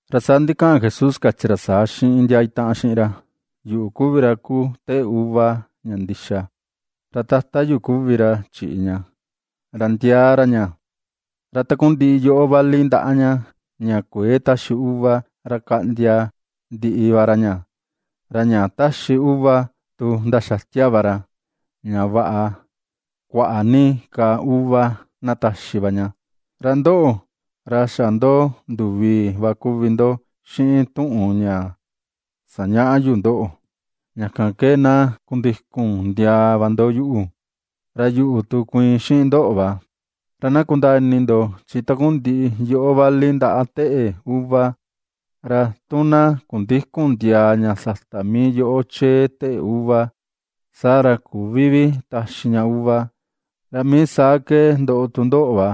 Ra saa ndikaꞌan Jesús kachi ra saa xiꞌin ndia itaꞌan xiꞌin ra: ―Yuꞌu kuvi ra kuu teꞌe uva ña ndixa, ra Tata yu kuvi ra chiꞌi ña, ra ndiaa ra ña. Ra takundiꞌi yoꞌó vali ndaꞌa ña, ña kuëe taxi uva, ra kaꞌndia ndiꞌi va ra ña, ra ña taxi uva, tu ndaxatia va ra, ña vaꞌa kuaꞌa ni ka uva na taxi va ña. Ra ndoꞌo, ra xa ndo nduvii va kuvi ndo xiꞌin tuꞌun ña sañaꞌa yu ndoꞌo. Ña kan ke na kundikun ndiaa va ndo yuꞌu, ra yuꞌu tu kuiin xiꞌin ndoꞌo va. Ra na kundaa ini ndo, chi takundiꞌi yoꞌó vali ndaꞌa teꞌe uva, ra tu na kundïkun ndiaa ña sata mii yoꞌo chee teꞌe uva, saa ra küvi vi taxi ña uva, ra mii saa ke ndoꞌo tu ndoꞌo va,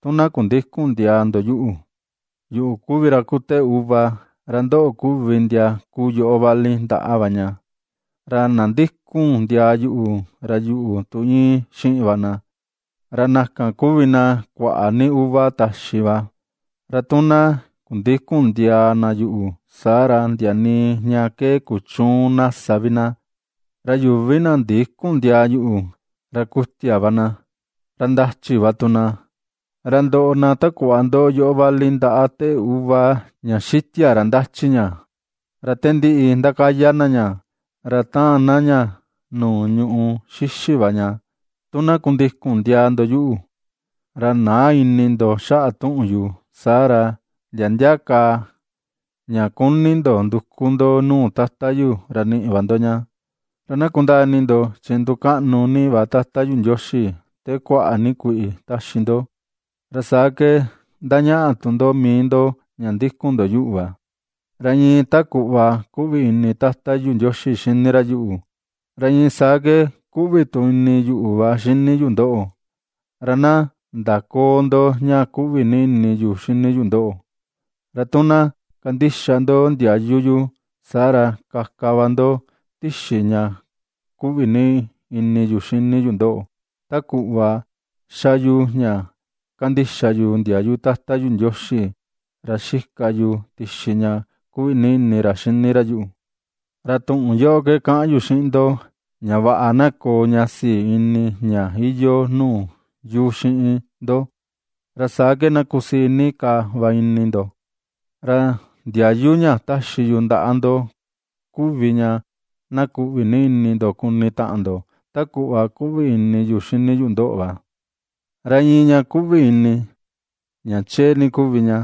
tu na kundïkun ndiaa ndo yuꞌu. ’Yuꞌu kuvi ra kuu teꞌe uva, ra ndoꞌo kuvi ndia kuu yoꞌo vali ndaꞌa va ña, ra na ndikun ndiaa yuꞌu, ra yuꞌu tu iin xiꞌin va na, ra na kan kuvi na kuaꞌa ni uva taxi va; ra tu na kundïkun ndiaa na yuꞌu, saa ra ndia nii ña ke kuchüun na sa vi na. Ra yuvi na ndïkun ndiaa yuꞌu, ra kutia va na, ra ndachi va tu na, ra ndoꞌo na ta kuꞌva ndoꞌo yoꞌo vali ndaꞌa teꞌe uva ña xitia ra ndachi ña, ra te ^ndiꞌi ndakaya na ña, ra taan na ña nuu ñùꞌù xixi va ña. ’Tu na kundikun ndiaa ndo yuꞌu, ra näa ini ndo xaꞌa tuꞌun yu, saa ra ndia ndia ka ña kuni ndo nduku ndo nuu Tata yu, ra niꞌi va ndo ña. Ra na kundaa ini ndo, chi ndukaꞌnu ni va Tata yu Ndioxi, te kuaꞌa ni kuiꞌi ^taxi ndo, ra saa ke ndañaꞌa tu ndo mii ndo ña ndikun ndo yuꞌu va. Ra iin ta kuꞌva kuꞌvi ini Tata yu Ndioxi xini ra yuꞌu, ra iin saa ke kuꞌvi tu ini yuꞌu va xini yu ndoꞌo, ra na ndaköo ndo ña kuꞌvi ini yu xini yu ndoꞌo. Ra tu na kandixa ndo ndiayu yu, saa ra kaka va ndo tixi ña kuꞌvi ini yu xini yu ndoꞌo, ta kuꞌva ^xa yuꞌu ña ^kandixa yu ndiayu Tata yu Ndioxi, ra xika yu tixi ña kuꞌvi ini ra xini ra yuꞌu. ’Ra tuꞌun yoꞌo ke kaꞌan yu xiꞌin ndo, ña vaꞌa na koo ña sii ini ña iyoo nuu yu xiꞌin ndo, ra saa ke na kusii ni ka va ini ndo. Ra ndiayu ña taxi yu ndaꞌa ndo kuvi ña: na kuꞌvi ni ini ndo kuni taꞌan ndo, ta kuꞌva ^kuꞌvi ini yuꞌu xini yu ndoꞌo va. Ra iin ña kuꞌvi ini ña chee ni kuvi ña,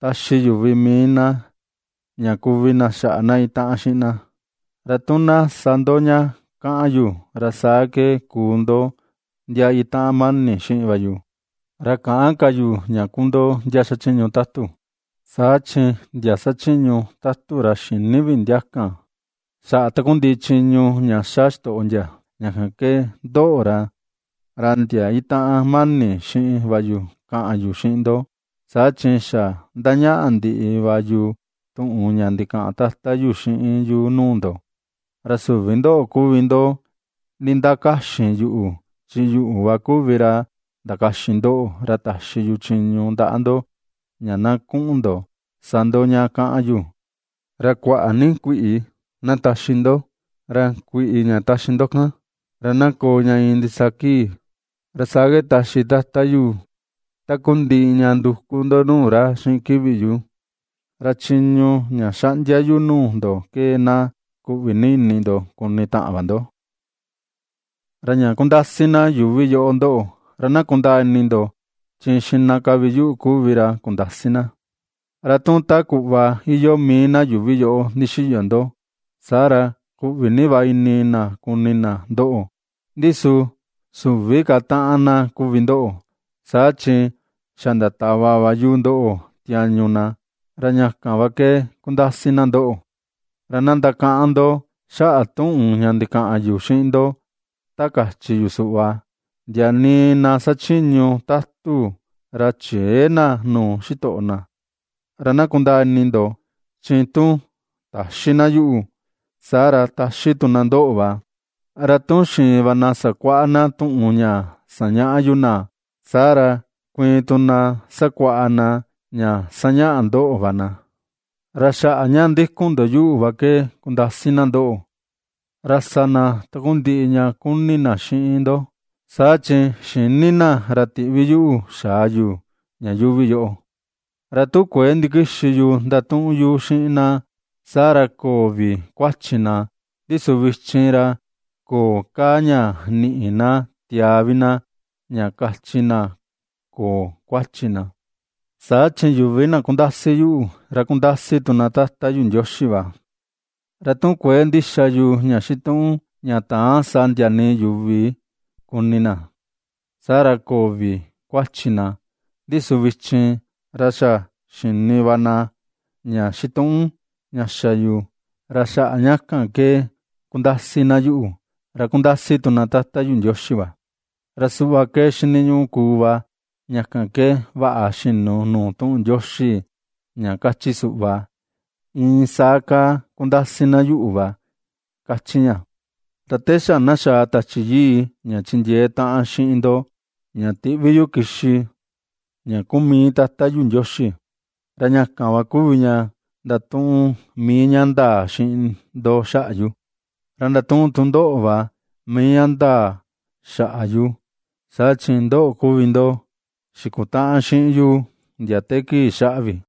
taxi yuvi mii na ña kuvi na xaꞌa na itaꞌan xiꞌin na. Ra tu na sa ndo ña kaꞌan yu, ra saa ke kuu ndo ndia itaꞌan mani xiꞌin va yu. Ra käꞌan ka yu ña kuu ndo, ndia xachiñu tatu, saa chi ndia xachiñu tatu ra xïni vi ndia kan, xaꞌa takundiꞌi chiñu ña xa xitoꞌo ndia. Ña kan ke ndoꞌo, ra ndia itaꞌan mani xiꞌin va yu kaꞌan yu xiꞌin ndo, saa chi xa ndañaꞌa ndiꞌi va yu tuꞌun ña ndikaꞌan Tata yu xiꞌin yu nuu ndo. Ra süvi ndoꞌo kuvi ndo nindakaxin yuꞌu, chi yuꞌu va kuvi ra ndakaxin ndoꞌo, ra taxi yu chiñu ndaꞌa ndo, ña na kuꞌun ndo sa ndo ña kaꞌan yu, ra kuaꞌa ni kuiꞌi na taxi ndo, ra kuiꞌi ña taxi ndo kan, ra na koo ña iin ndisaa kii, ra saa ke taxi Tata yu takundiꞌi ña nduku ndo nuu ra xiꞌin kivi yu. Ra chiñu ña xaꞌndia yu nuu ndo ke, na kuꞌvi ni ini ndo kuni taꞌan va ndo. ’Ra ña kundasi na yuuvi yoꞌo ndoꞌo, ra na kundaa ini ndo, chi xiꞌna ka vi yuꞌu kuvi ra kundasi na. Ra tu ta kuꞌva iyoo mii na yuuvi yoꞌo ndixiyo ndo, saa ra kuꞌvi ni va ini na kuni na ndoꞌo, ndi su süvi ka taꞌan na kuvi ndo, saa chi xa ndatava va yu ndoꞌo tiañu na, ra ña kan va ke kundasi na ndoꞌo. Ra na ndakaꞌan ndo xaꞌa tuꞌun ña ndikaꞌan yu xiꞌin ndo, ta kachi yu suꞌva: “Ndia nii na xachiñu tatu ra chëe na nuu xitoꞌo na.” Ra na kundaa ini ndo, chi tu taxi na yuꞌu, saa ra taxi tu na ndoꞌo va; ra tu xiin va na sakuaꞌa na tuꞌun ña sañaꞌa yu na, saa ra kuiin tu na sakuaꞌa na ña sañaꞌa ndoꞌo va na. Ra xaꞌa ña ndikun ndo yuꞌu va ke kundasi na ndoꞌo, ra sa na takundiꞌi ña kuni na xiꞌin ndo, saa chi xïni na ra tiꞌvi yuꞌu xaa yu, ña yuuvi yoꞌo. ’Ra tu kuëe ndikixi yu ndatuꞌun yu xiꞌin na, saa ra köo vi kuachi na, ndi su vichin, ra köo ka ña niꞌi na tiaa vi na, ña kachi na köo kuachi na, saa chi yuvi na kundasi yuꞌu, ra kundasi tu na Tata yu Ndioxi va. Ra tu kuëe ndixa yu, ña xituꞌun ña täan sa ndia nii yuvi kuni na, saa ra köo vi kuachi na, ndi su vichin, ra xa xini va na ña xituꞌun xa yu, ra xaꞌa ña kan ke ^kundasi na yuꞌu, ra ^kundasi tu na Tata yu Ndioxi va. Ra suꞌva ke xiniñuꞌu kuu va, ña kan ke vaꞌa xinu nuu tuꞌun Ndioxi ña kachi suꞌva: “Iin saa kaa kundasi na yuꞌu va”, kachi ña. ’Ra te xa na xa̱a̱ Tachi Yii ña chindiee taꞌan xiꞌin ndo, ña tiꞌvi yu kixi, ña kuu mii Tata yu Ndioxi, ra ña kan va kuvi ña ndatuꞌun mii ña ndaa xiꞌin ndo xaꞌa yu. Ra ndatuꞌun tu ndoꞌo va mii ña ndaa xaꞌa yu, saa chi ndoꞌo kuvi ndo xikutaꞌan xiꞌin yu ndia te kii xaꞌa vi.